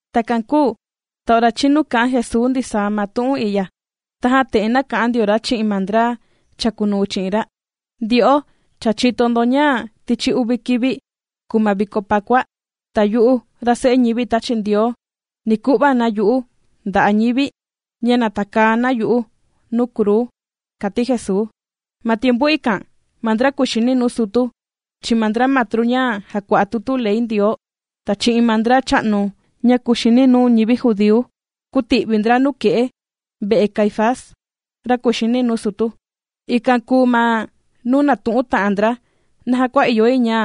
Takan kūu ta ora chīnu kā'an Jesuu ndisaa ma tu'un i'ya, tajan te'en nāka'an ndio ra chi'in ma ndra chàkunuu chi'in ra: ―Ndyo'o, cha chìto ndo ña tichi uvi kivi, kùu ma viko Pakua, ta yu'u ra Se'e ñivi tāchi Ndioo, ni ku'va na yu'u nda'a' ñivi, ña na takaa na yu'u nuu kruu ―kàti Jesuu. Ma tiempu ikan, ma ndra kùxini nuu sutu, chi'in ma ndra matru ña jàkua'a tutu ley Ndioo, ta chi'in ma ndra cha'nu ña kuxini nuu ma ndian judíu, kūti'vi ndra nuke'e ve'e Caifás, ra kùxini nuu sutu. Ikan kùu ma nuu nātu'un ta'an ndra naja kua ìyo yi ña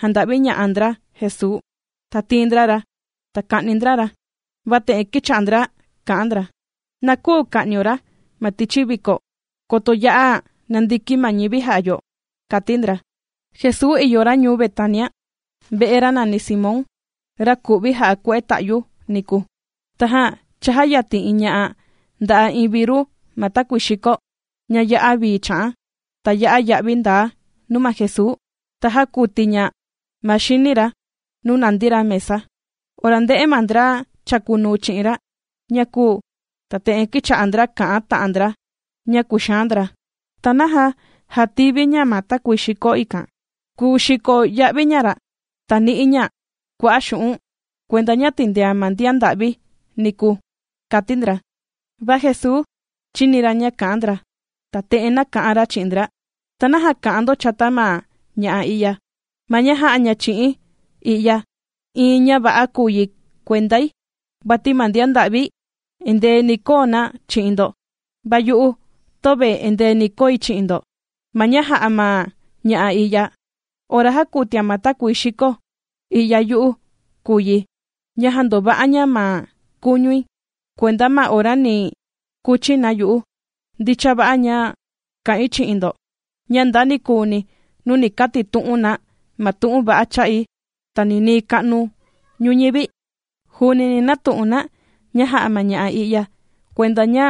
janda'viña'a ndra Jesuu, ta tiin ndra ra, ta ka'ni ndra ra. Va te'en kīcha'a ndra kà'an ndra: ―Na küu ka'nio ra ma tichi viko, koto ya'a nandiki ma ñivi jà'a yo, ―kàti ndra. Jesuu ìyo ra ñuu Betania, ve'e ra nàni Simón, ra ku'vi jà'a kue'e ta'yu niku. Tajan chājayatin iin ña'a nda'a iin viru ma takuii xikó, ña ya'a vii chà'an, ta ya'a ya'vi ndaa nuu ma Jesuu, ta jākuti ña ma xini ra nuu nàndi ra mesa. Ora ndē'e ma ndra chàkunuu chi'in ra ña kūu, ta te'en kīcha'a ndra kà'an ta'an ndra ña kùxaan ndra: ―¿Ta naja jātivi ña ma takuii xikó ikan? Kùu xiko ya'vi ña ra', ta ni'i ña kua'a' xu'un', kuenda ña tìndean ma ndian nda'vi niku ―kàti ndra. Va Jesuu chīni ra ña kà'an ndra, ta te'en nāka'an ra chi'in ndra: ―¿Ta naja kà'an ndo chata ma ña'a i'ya? Ma ña jā'a ña chi'i̱n i'ya, iin ña va'a kùu yi kuendai. Vati ma ndian nda'vi, endee ni koo na chi'in ndo, va yu'u, töve endee ni koi chi'in ndo. Ma ña jā'a ma ña'a i'ya, ora jākutian ma takuii xikó i'ya yu'u kùu yi, ña jāndova'a ña ma kuñui kuenda ma ora ni kuchi na yu'u. Ndicha va'a, ña kà'in chi'in ndo, ña nda nikuuni nuu ni katitu'un na ma tu'un va'a cha'i, ta ninii ka'nu ñuñivi, juuni ni natu'un na, ña jā'a ma ña'a i'ya, kuenda ña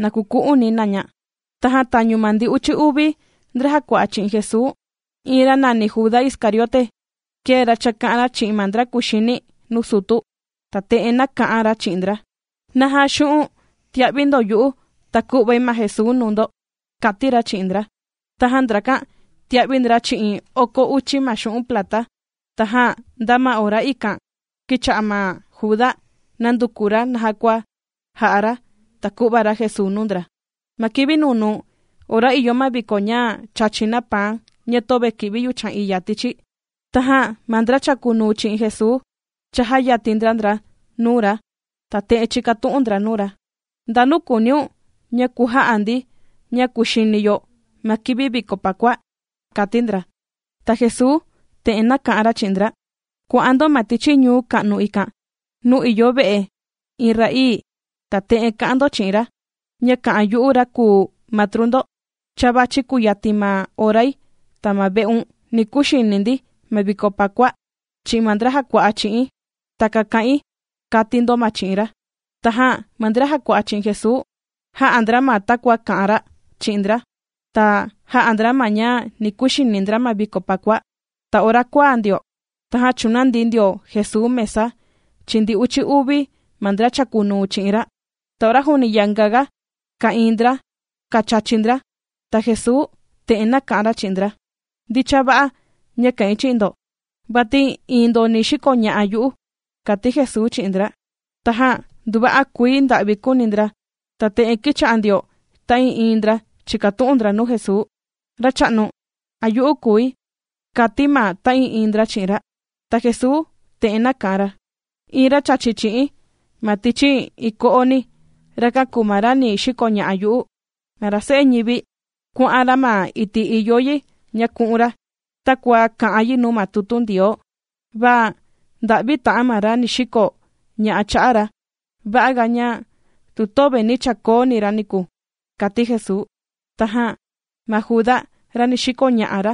na kuku'uni na ña. Tajan tañu ma ndi uchi uvi, ndra jàkua'a chi'in Jesuu, iin ra nàni Juda Iscariote, kēe ra chāka'an ra chi'in ma ndra kuxini nuu sutu, ta te'en nāka'an ra chi'in ndra: ―¿Naja tia'vi ndo yu'u, ta ku'vai ma Jesuu nuu ndo? ―kàti ra chi'in ndra. Tajan ndrakan tīa'vi ndra chi'in oko uchi ma xu'un' plata. Tajan nda ma ora ikan kīcha'a ma Juda nànduku ra naja kua jà'a ra, ta ku'va ra Jesuu nuu ndra. Ma kivi nunuu, ora ìyo ma viko ña chàchi na paan ña töve kì'vi yuchan iya tichi, tajan ma ndra chàkunuu chi'in Jesuu chājayatin ndra ndra nuu ra, ta te'en chīkatu'un ndra nuu ra: ―¿Ndanu kùuniun ña kuja'a ndi, ña kùxini yo ma kivi viko Pakua? ―kàti ndra. Ta Jesuu te'en nāka'an ra chi'in ndra: ―Kuà'an ndo ma tichi ñuu ka'nu ikan, nuu ìyo ve'e iin ra'ii, ta te'en ka'an ndo chi'in ra, ña kà'an yu'u ra kùu Matru ndo: “Cha vàchi kuyatin ma orai, ta ma ve'un, ni kuxini ndi ma viko Pakua chi'in ma ndra jàkua'a chi'i̱n.” Takan kà'in, kati ndo ma chi'in ra. Tajan ma ndra jàkua'a chi'in Jesuu, jā'a ndra ma takua kā'an ra chi'in ndra, ta jā'a ndra ma ña ni kuxini ndra ma viko Pakua. Ta ora kuaa ndio, tajan chūnandi ndio Jesuu mesa chi'in ndi uchi uvi ma ndra chàkunuu chi'in ra. Ta ora juuni yanga ka'ìin ndra kàchachi ndra, ta Jesuu, te'en nāka'an ra chi'in ndra: ―Ndicha va'a, ña kà'in chi'in ndo, vati iin ndo ni xikoña'a yu'u ―kàti Jesuu chi'in ndra. Tajan nduva'a kuii nda'vi kūuni ndra, ta te'en kīcha'a ndio ta'ii'iin ndra chìkatu'un ndra nuu Jesuu: ―Racha'nu, ¿a yu'u kùi? ―kàti ndra ma ta'ii'iin ndra chi'in ra. Ta Jesuu te'en nāka'an ra: ―Iin ra chàchi chi'i̱n ma tichi iin ko'oni, rakan kùu ma ra ni xikoña'a yu'u. Ma ra Se'e ñivi, kuà'an ra ma iti' ìyo yi ña ku'un ra, takua kà'an yi nuu ma tutu Ndioo. Va ¡nda'vi ta'an ma ra ni xiko ña'a cha'a ra! Va'a ga, ña tu töve nī chakoo ni ra niku ―kàti Jesuu. Tajan ma Juda, ra ni xikoña'a ra,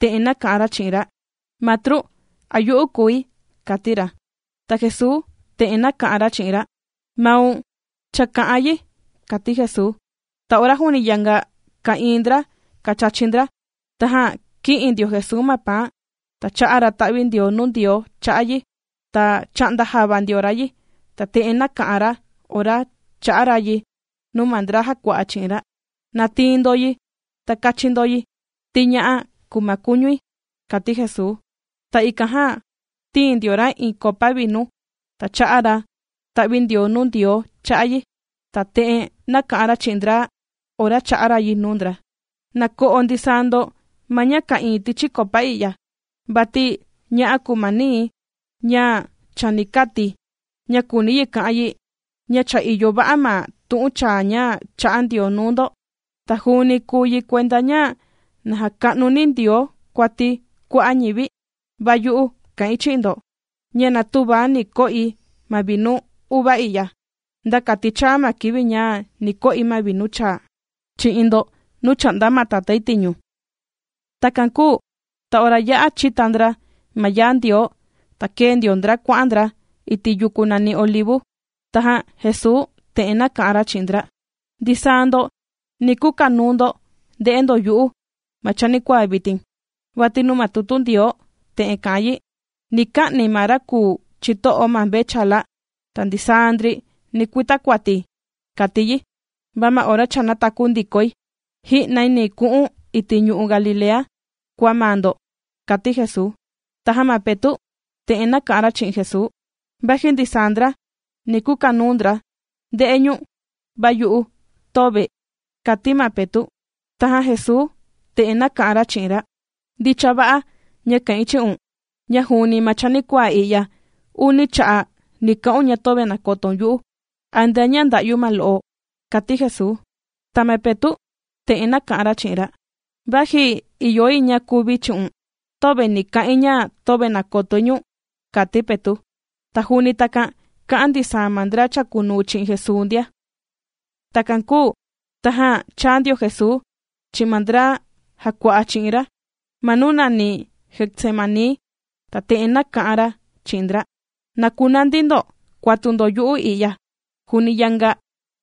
te'en nāka'an ra chi'in ra: ―Matru, ¿a yu'u kùi? ―kàti ra. Ta Jesuu te'en nāka'an ra chi'in ra: ―¡Maun cha kā'an yi! ―kàti Jesuu. Ta ora juuni yanga ka'ìin ndra kàchachi ndra, tajan kī'in ndio Jesuu ma paan, ta chā'a ra ta'vindioo nuu Ndioo cha'a' yi, ta chā'nda java ndio ra yi, ta te'en nāka'an ra ora chā'a ra yi nuu ma ndra jàkua'a chi'in ra: ―Na tiin ndo yi ta kàchi ndo yi, ti ña'á kùu ma kuñui ―kàti Jesuu. Ta ikan jan, tīin ndio ra iin copa vinu, ta chā'a ra ta'vindioo nuu Ndioo cha'a' yi, ta te'en nāka'an ra chi'in ndra ora chā'a ra' yi nuu ndra: ―Na ko'o ndisaa ndo ma ña ka'ìin tichi copa i'ya, vati ña'á kùu ma nii̱, ña chani kati̱, ña kùuni yi ka'an yi, ña cha ìyo va'a ma tu'un chaa ña chā'a Ndioo nuu ndo, ta juuni kùu yi kuenda ña na jàka'nuni Ndioo kuati kua'a' ñivi. Va yu'u kà'in chi'in ndo, ña na tüva ni ko'i ma vinu uva i'ya, nda kati chāa ma kivi ña ni ko'i ma vinu chaa chi'in ndo, nuu chà'nda ma Tatái tiñu. Takan kūu ta ora yā'a chīta ndra ma yaa Ndioo, ta kēe ndio ndra kuà'an ndra iti' yuku nàni Olivu. Tajan Jesuu te'en nāka'an ra chi'in ndra: ―Ndisaa ndo, ni kukanuu ndo nde'e ndo yu'u ma chanikuaa vitin. Vati nuu ma tutu Ndioo, te'en kà'an yi: “Ni ka'ni̱ ma ra kùu chito'o ma mvechala, ta ndisaa ndri, ni kuita kuati”, kàti yi. Va ma ora cha nātaku ndikoi, ji'nai ni ku'un iti' ñu'u' Galilea, kua maa ndo ―kàti Jesuu. Tajan ma Petu' te'en nāka'an ra chi'in Jesuu: ―Vaji ndisaa ndra ni kukanuu ndra nde'e ñu̱n, va yu'u, töve ―kàti ma Petu'. Tajan Jesuu te'en nāka'an ra chi'in ra: ―Ndicha va'a ña kà'in chi'un, ña juuni ma chanikuaa i'ya, uni cha'a' ni ka'un ña töve nàkotoun yu'u antea ña nda'yu ma lo'o ―kàti Jesuu. Ta ma Petu' te'en nāka'an ra chi'in ra: ―Vaji ìyo yi ña kuvi̱ chi'un, töve ni ka'in ña töve nakotoi ñu̱n ―kàti ma Petu'. Ta juuni takan kā'an ndisaa ma ndra chàkunuu chi'in Jesuu ndia. Takan kūu tajan chāa ndio Jesuu, chi'in ma ndra jàkua'a chi'in ra, ma nuu nàni Getsemaní, ta te'en nāka'an ra chi'in ndra: ―Na kunandi ndo kuatu ndo yu'u i'ya, juuni yanga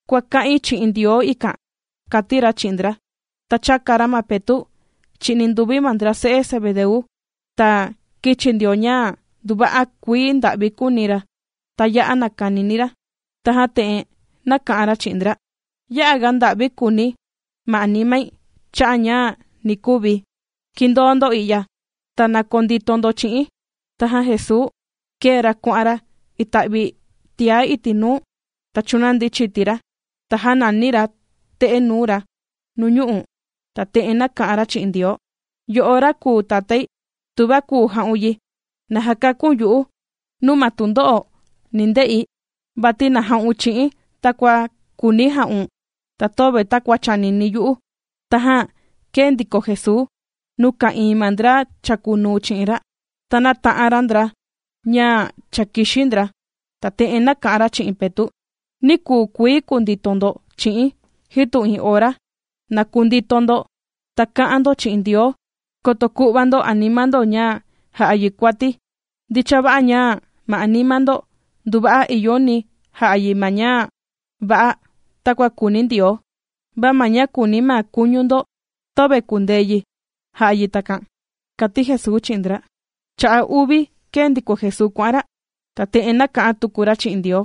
kuàka'in chi'in Ndioo ikan ―kàti ra chi'in ndra. Ta chāka ra ma Petu', chi'in ninduvi ma ndra se'e Zebedeu, ta kīchi ndio ña nduva'a kuii nda'vi kūuni ra, ta yā'a nàkanini ra. Tajan te'en nāka'an ra chi'in ndra: ―Ya'a ga nda'vi kùuni ma animai cha'a' ña ni kuvi̱. Kindoo ndo i'ya, ta na kondito ndo chi'i̱n. Tajan Jesuu kēe ra kuà'an ra ita'vi tiá iti' nuu, ta chūnandi chiti ra, ta jānani ra te'e nuu ra nuñu'u', ta te'en nāka'an ra chi'in Ndioo: ―Yo'o ra kùu Tatái, tuva kùu ja'un yi, na jakakun yu'u nuu ma tundo'o ni nde'i. Vati na ja'un chi'i̱n takua kùuni maun ja'un ta töve takua chànini yu'u. Tajan kēe ndiko Jesuu nuu ka'ìin ma ndra chàkunuu chi'in ra, ta nāta'an ra ndra ña cha kìxi ndra. Ta te'en nāka'an ra chi'in Petu': ―¿Ni küu kuii kundito ndo chi'i̱n, jitu iin ora? Na kundito ndo, ta ka'an ndo chi'in Ndioo, koto ku'va ndo anima ndo ña ja'a yi kuati. Ndicha va'a ña ma anima ndo nduva'a ìyoni yi ja'a yi ma ña va'a takua kùuni Ndioo, va ma ña kùuni ma kuñu ndo töve kùndee yi ja'a yi takan ―kàti Jesuu chi'in ndra. Cha'a' uvi kēe ndiko Jesuu kuà'an ra, ta te'en nāka'an tuku ra chi'in Ndioo: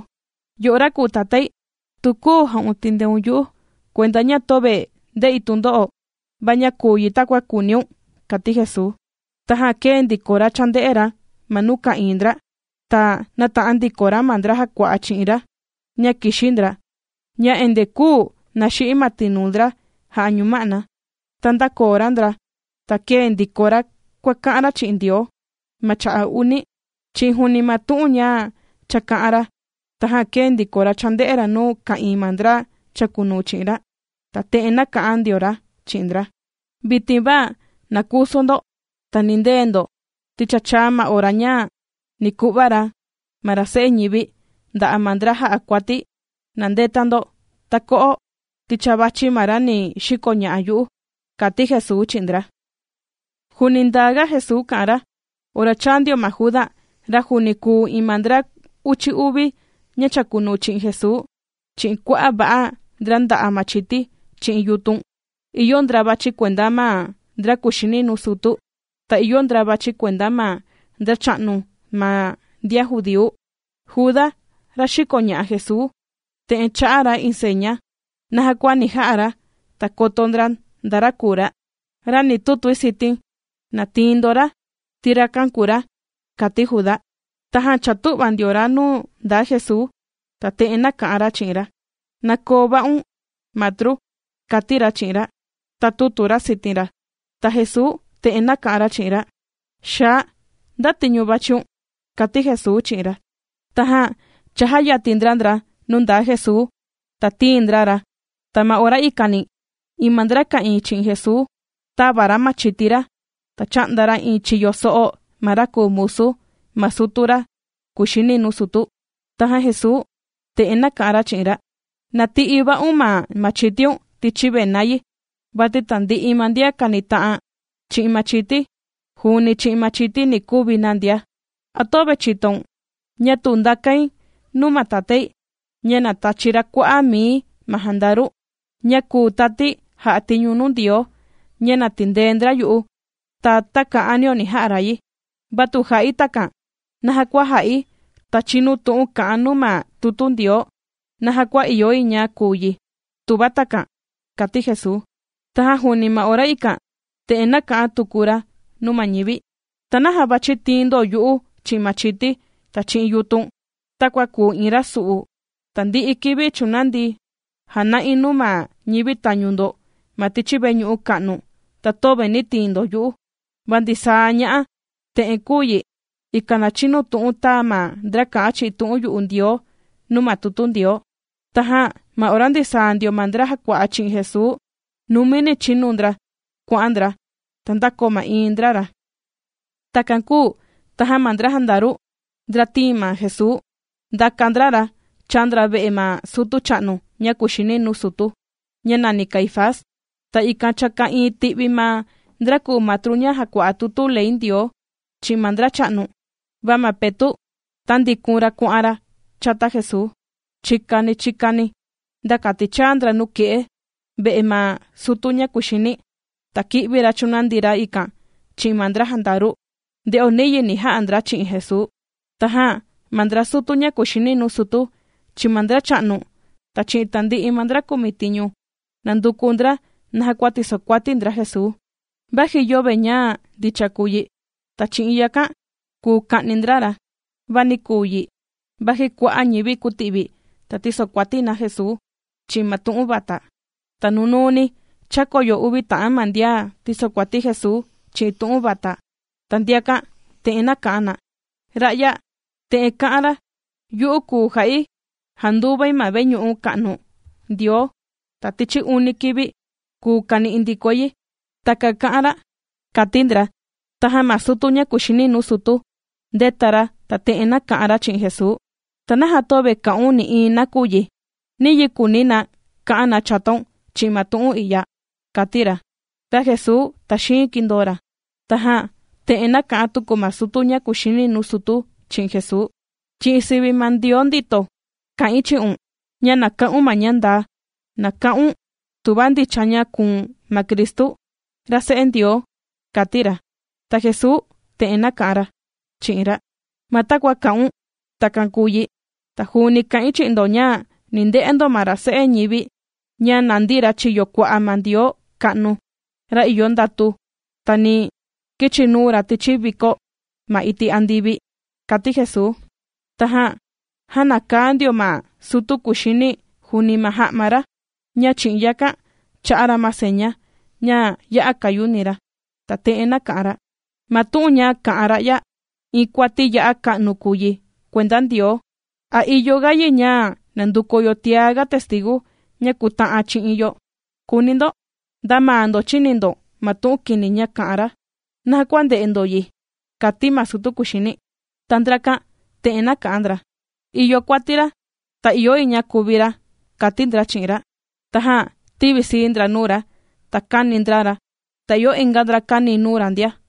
―Yo'o ra kùu Tatái, tu küu ja'un tìndeun yu'u, kuenda ña töve nde'i tundo'o, va na kuu yi takua kùuniun ―kàti Jesuu. Tajan kēe ndiko ra chānde'e ra ma nuu ka'ìin ndra, ta nāta'an ndiko ra ma ndra jàkua'a chi'in ra, ña kìxi ndra ña endee küu naxi'i ma tinuu ndra jà'a ñuma'na. Ta ndākoo ra ndra, ta kēe ndiko ra kuàka'an ra chi'in Ndioo, ma cha'a' uni, chi'in juuni ma tu'un ña cha kā'an ra. Tajan kēe ndiko ra chānde'e ra nuu ka'ìin ma ndra chàkunuu chi'in ra, ta te'en nāka'an ndio ra chi'in ndra: ―Vitin va, na kusu ndo, ta nindee ndo, ti cha chāa ma ora ña ni ku'va ra ma ra Se'e ñivi, nda'a' ma ndra jà'a kuati. Na ndeta ndo, ta ko'o, ti cha vàchi ma ra ni xikoña'a yu'u ―kàti Jesuu chi'in ndra. Juuni ndaa ga Jesuu kà'an ra, ora chāa ndio ma Juda, ra juuni kùu iin ma ndra uchi uvi, ña chàkunuu chi'in Jesuu, chi'in kua'a' va'a, ndra nda'a machiti, chi'in yutun. Ìyo ndra vàchi kuenda ma ndra kuxini nuu sutu, ta ìyo ndra vàchi kuenda ma ndracha'nu ma ndian judíu. Juda, ra xìkoña'a Jesuu, te'en chā'a ra iin seña, naja kua ni ja'a ra, ta koto ndra nda ra kùu ra: ―Ra ni tutui sitin kùu ra, ikan na tiin ndo ra ―kàti Juda. Tajan chātu'va ndio ra nuu ndaa Jesuu, ta te'en nāka'an ra chi'in ra: ―¡Na koo va'un, Matru! ―kàti ra chi'in ra. Ta tūtu ra sitin ra. Ta Jesuu te'en nāka'an ra chi'in ra: ―Xaa, ¿nda tiñu vàchiun? ―kàti Jesuu chi'in ra. Tajan chājayatin ndra ndra nuu ndaa Jesuu, ta tīin ndra ra. Ta ma ora ikani, iin ma ndra ka'ìin chi'in Jesuu, tāva ra machiti ra, ta chā'nda ra iin chiyo so'o ma ra kùu musu ma sutu ra kuxini nuu sutu. Tajan Jesuu te'en nāka'an ra chi'in ra: ―Na ti'i va'un ma machitiun tichi vena yi, vati tandi'i ma ndian kànita'an chi'in machiti, juuni chi'in machiti ni kuvi na ndia. ¿A töve chìtoun, ña tu ndakain nuu ma Tatái, ña na tachi ra kua'a' mii ma jandaru, ña kùu tati jà'a tiñu nuu Ndioo, ña na tindee ndra yu'u, ta takan ni ja'a ra yi? Va tu jà'i takan, ¿naja kua jà'i, ta chinu tu'un kà'an nuu ma tutu Ndioo, naja kua ìyo yi ña kuu yi, tuva takan? ―kàti Jesuu. Tajan juuni ma ora ikan, te'en nāka'an tuku ra nuu ma ñivi: ―¿Ta naja vàchi tiin ndo yu'u chi'in machiti, ta chi'in yutun, takua kùu iin ra su'u? Tandi'i kivi chūnandi̱ jāna'i nuu ma ñivi tañu ndo ma tichi veñu'u ka'nu, ta töve nī tiin ndo yu'u. Va ndisaa ña'a te'en kùu yi, ikan na chinu tu'un tāa ma ndra kā'an chi'in tu'un yu'u Ndioo nuu ma tutu Ndioo. Tajan ma ora ndisaa ndio ma ndra jàkua'a chi'in Jesuu, numini chīnu ndra kuà'an ndra, ta ndākoo ma'iin ndra ra. Takan kūu tajan ma ndra jandaru, ndra tīin ma Jesuu, ndàka ndra ra chāa ndra ve'e ma sutu cha'nu ña kuxini nuu sutu ña nàni Caifás. Ta ikan cha ka'ìin ti'vi ma ndra kùu matru ña jàkua'a tutu ley Ndioo, chi'in ma ndra cha'nu. Va ma Petu', tāndikun ra kuà'an ra chata Jesuu, chikani chikani, nda kati chāa ndra nuke'e ve'e ma sutu ña kuxini, ta kī'vi ra chūnandi ra ikan chi'in ma ndra jandaru, nde'o niyi ni ja'a ndra chi'in Jesuu. Tajan ma ndra sutu ña kùxini nuu sutu, chi'in ma ndra cha'nu, ta chi'in tandi'i ma ndra kumitiñu, nànduku ndra naja kua tìsokuati ndra Jesuu, vaji yöve ña ndicha kùu yi. Ta chi'in yakan kùu ka'ni ndra ra. Va nī kuu yi, vaji kua'a' ñivi kūti'vi, ta tīsokuati na Jesuu chi'in ma tu'un vata. Ta nunuuni chākoyo uvi ta'an ma ndian tīsokuati Jesuu chi'in tu'un vata. Ta ndiakan te'en nāka'an na: ―Ra'ya, te'en kā'an ra: “Yu'u kùu ja'i janduvai ma veñu'u ka'nu Ndioo, ta tichi uni kivi kùu kani'i ndikoi yi.” Takan kā'an ra ―kàti ndra. Tajan ma sutu ña kùxini nuu sutu, ndēta ra, ta te'en nāka'an ra chi'in Jesuu: ―¿Ta naja töve kà'un nï'iin nakuyi? ¿Niyi kùuni na ka'an na chataun chi'in ma tu'un i'ya? ―kàti ra. Va Jesuu tàxiin kīndoo ra. Tajan te'en nāka'an tuku ma sutu ña kuxini nuu sutu chi'in Jesuu: ―Chi'in sivi ma Ndioo ndito, kà'in chi'un, ña na ka'un ma ña ndaa. Na ka'un, tuva ndicha ña kùu̱n ma Cristu, ra Se'e Ndioo ―kàti ra. Ta Jesuu te'en nāka'an ra chi'in ra: ―Ma takua kā'un, takan kùu yi. Ta juuni kà'in chi'in ndo, ña ni nde'e ndo ma ra Se'e ñivi, ña nàndi ra chiyo kua'a ma Ndioo ka'nu, ra ìyo ndatu, ta ni kichinuu ra tichi vikó ma iti' andivi ―kàti Jesuu. Tajan jānakaa ndio ma sutu kuxini juuni ma ja'ma ra, ña chi'in yakan, chā'a ra ma seña, ña ya'a kayuni ra, ta te'en nāka'an ra: ―Ma tu'un ña kā'an ra'ya, iin kuati ya'a ga ka'nu kùu yi kuenda Ndioo. ¿A ìyo ga yi ña nanduku yo tia ga testigu ña kùta'an chi'in yo?, kùuni ndo. Nda maa ndo chīni ndo ma tu'un kini ña kā'an ra. ¿Naja kua ndè'e ndo yi? ―kàti ma sutu kuxini. Ta ndrakan te'en nāka'an ndra: ―Ìyo kuati ra, ta ìyo yi ña kuvi ra ―kàti ndra chi'in ra. Tajan tīvisii ndra nuu ra, ta kāni ndra ra. Ta ìyo inga ndra kāni nuu ra ndia,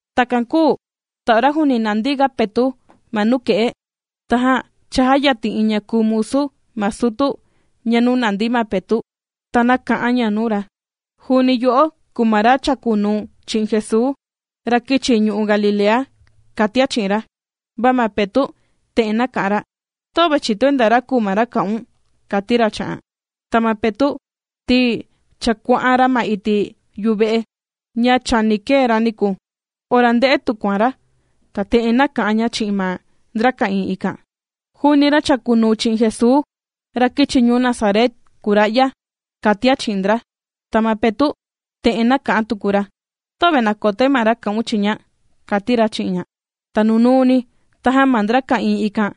Takan kūu ta ora juuni nàndi ga Petu' ma nuke'e, tajan chājayatin iin ña kùu musu ma sutu nuu nàndi ma Petu', ta te'en nāka'an ña nuu ra: ―Juuni yo'o kùu ma ra chàkunuu chi'in Jesuu, ra kīchi ñu'u' Galilea ―kàtian chi'in ra. Va ma Petu' te'en nāka'an ra: ―Töve chìtoi nda ra kùu ma ra kà'un ―kàti ra chi'an. Ta ma Petu', ti cha kuà'an ra ma iti' yuve'e, ña chani kee ra niku, ora ndē'e tukuan ra, ta te'en nāka'an ña chi'in ma ndra ka'ìin ikan: ―Juuni ra chàkunuu chi'in Jesuu, ra kīchi ñuu Nazaret kùu ra'ya ―kàtian chi'in ndra. Ta ma Petu' te'en kà'an tuku ra: ―Töve nàkotoi ma ra kà'un chiña ―kàti ra chi'in ña. Ta nunuuni, tajan ma ndra ka'ìin ikan,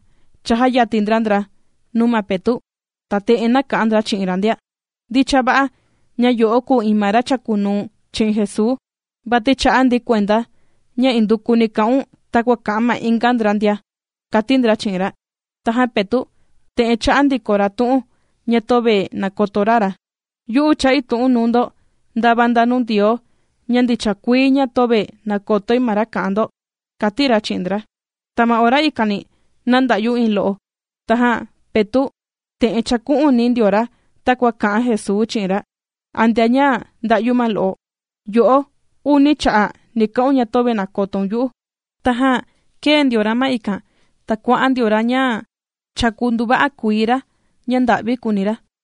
chājayatin ndra ndra nuu ma Petu', ta te'en nāka'an ndra chi'in ra ndia: ―Ndicha va'a ña yo'o kùu iin ma ra chàkunuu chi'in Jesuu, vati chà'a ndi kuenda ña indukuni kà'un takua kà'an ma inga ndra ndia ―kàti ndra chi'in ra. Tajan Petu' te'en chā'a ndiko ra tu'un, ña töve nàkoto ra ra: ―Yu'u chà'i tu'un nuu ndo ndava nda nuu Ndioo, ña ndicha kuii, ña töve nàkotoi ma ra kà'an ndo ―kàti ra chi'in ndra. Ta ma ora ikani nānda'yu iin lo'o. Tajan Petu' te'en chāku'uni ndio ra takua kā'an Jesuu chi'in ra: “Antea ña nda'yu ma lo'o, yo'o uni cha'a' ni ka'un ña töve nàkotoun yu'u.” Tajan kēe ndio ra ma ikan, ta kuà'an ndio ra ña chāku nduva'a kuii ra, ña nda'vi kùuni ra.